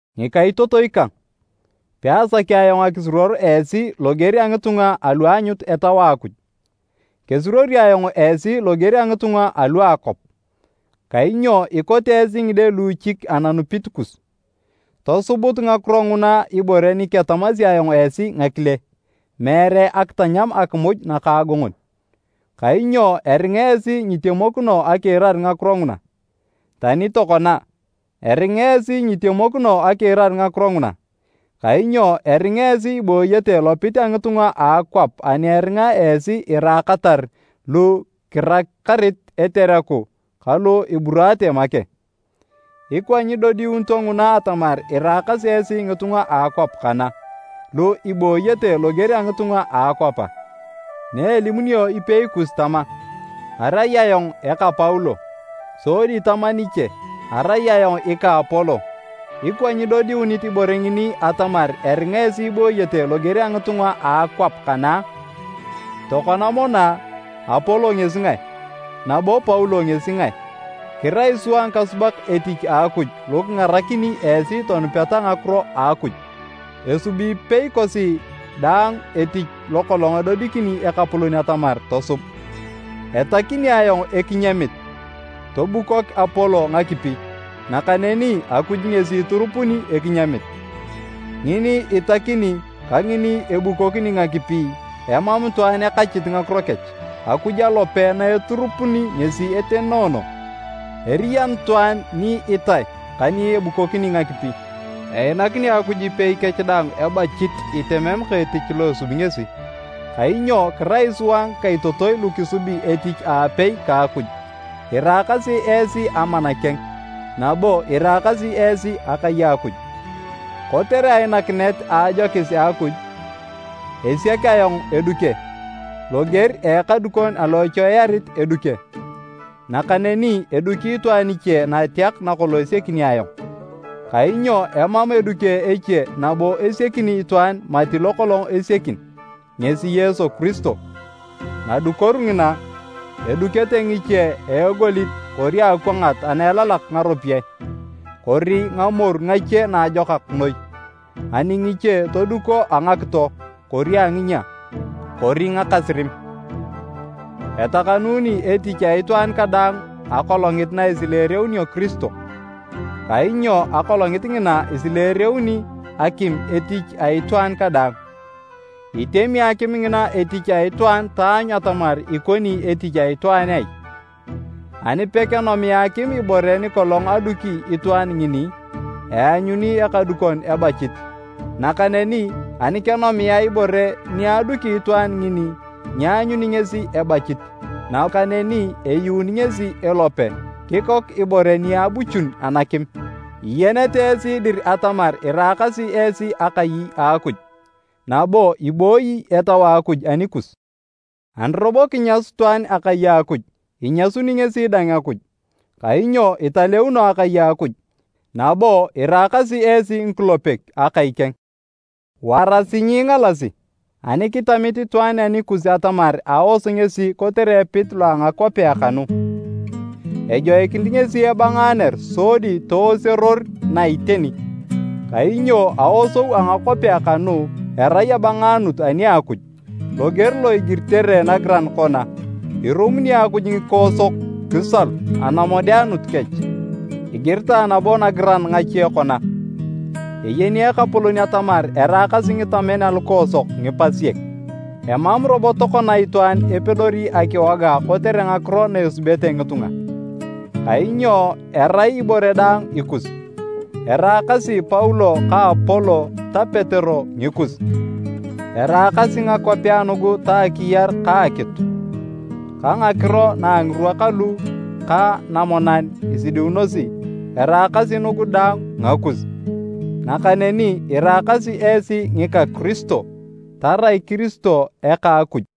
Ngikaitotoi kang, peasaki ayong akisuruor esi loger a ngitunga alu aanyut Etau a Akuj. Kesuruori ayong esi loger a ngitunga alu a akwap, kainyo ikote esi ngide luuchik ananupit kus. Tosubut ngakiro nguna ibore ni ketamasi ayong esi ngakile, meere akitanyam akimuj nakaagongon, kainyo eringa esi nyitemokino akiirar ngakiro nguna. Tani tokona, eringa esi nyitemokino akiirar ngakiro nguna, kainyo eringa esi ibooyete lopit a ngitunga a akwap ani eringa esi iraakatar lu kirakarit etereku ka lu iburaate make. Ikwa nyidodiunito nguna atamar iraakasi esi ngitunga a akwap kana, lu ibooyete loger a ngitunga a akwap a? Naelimunio ipei kus tama, “Arai ayong eka Paulo,” sodi tama niche, “Arai ayong ika Apolo”, ikwa nyidodiunit ibore ngini atamar eringa esi ibooyete loger a ngitunga a akwap kana a? Tokona mono a, Apolo ngesi ngae? Nabo Paulo ngesi ngae? Kirai sua ngikasubak etich a Akuj lu kingarakini esi tonupeta ngakiro a Akuj. Esubi ipei kosi daang etich lokolong edodikini Ekapolon atamar tosub. Etakini ayong ekinyamit, tobukok Apolo ngakipi, nakaneni Akuj ngesi iturupuni ekinyamit. Ngini itakini ka ngini ebukokini ngakipi, emam itwaan ekachit ngakiro kech. Akuj alope na eturupuni ngesi etenoono. Eriyan itwaan ni itae ka ni ebukokini ngakipi, einakini Akuj ipei kech daang ebachit itemem ka etich lo esubi ngesi. Kainyo kirai sua ngikaitotoi lu kisubi etich aapei ka Akuj, iraakasi esi amana keng. Nabo iraakasi esi akai a Akuj. Kotere ainakinet a ajokis a Akuj, esiak ayong eduke, loger a ekadukon alo echoiyarit eduke, nakaneni eduki itwaan iche nateak nakolong esiakini ayong. Kainyo emam eduke eche nabo isiakini itwaan mati lokolong esiakin, ngesi Yesu Kiristo. Nadukoru ngina, edukete ngiche a egolit kori akwangat na elalak ngaropiyae, kori ngamoru ngache naajokak noi. Ani ngiche, toduko a ngakito, kori a nginyia, kori ngakasirim. Etakanuuni etich a itwaan kadaang Akolongit na isileereunio Kiristo, kainyo Akolongit ngina, isileereuni akim etich a itwaan kadaang. Itemi akim ngina etich a itwaan taanyu atamar ikoni etich a itwaan ai! Ani pekenomia akim ibore nikolong aduki itwaan ngini, eanyuni ekadukon ebachit. Nakaneni ani kenomia ibore ni aduki itwaan ngini, nyeanyuni ngesi ebachit, nakaneni eyuun ngesi elope, kikok ibore ni abuchun anakim. Iyenete esi dir atamar iraakasi esi akai a Akuj, nabo ibooyi Etau a Akuj anikus! Ani robo kinyasu itwaan akai a Akuj, inyasuni ngesi dang Akuj, kainyo italeuno akai a Akuj, nabo iraakasi esi ngikulepek akai keng. Warasi nyiingalasi! Ani kitamit itwaan anikus atamar aos ngesi kotere epit lo a ngakwapea kanu, ejoikinit ngesi ebangaaner sodi tooseror na iteni. Kainyo aosou a ngakwapea kanu erai abangaanut ani a Akuj. Loger lo igiritere nagiran kona, “Irumuni Akuj ngikoosok kisalu anamodeanut kech.” Igiritae nabo nagiran ngache kona, “Eyeni Ekapolon atamar eraakasi ngitamen alukoosok ngipasiek.” Emam robo tokona itwaan epedori akiwoga kotere ngakiro na esubete ngitunga, kainyo erai ibore daang ikus: eraakasi Paulo ka Apolo ta Petero ngikus. Eraakasi ngakwapea nugu ta akiyar ka akitu, ka ngakiro na a ngirwa kalu ka namonan isidiunosi, eraakasi nugu daang ngakus, nakaneni iraakasi esi ngika Kiristo, tarai Kiristo eka a Akuj.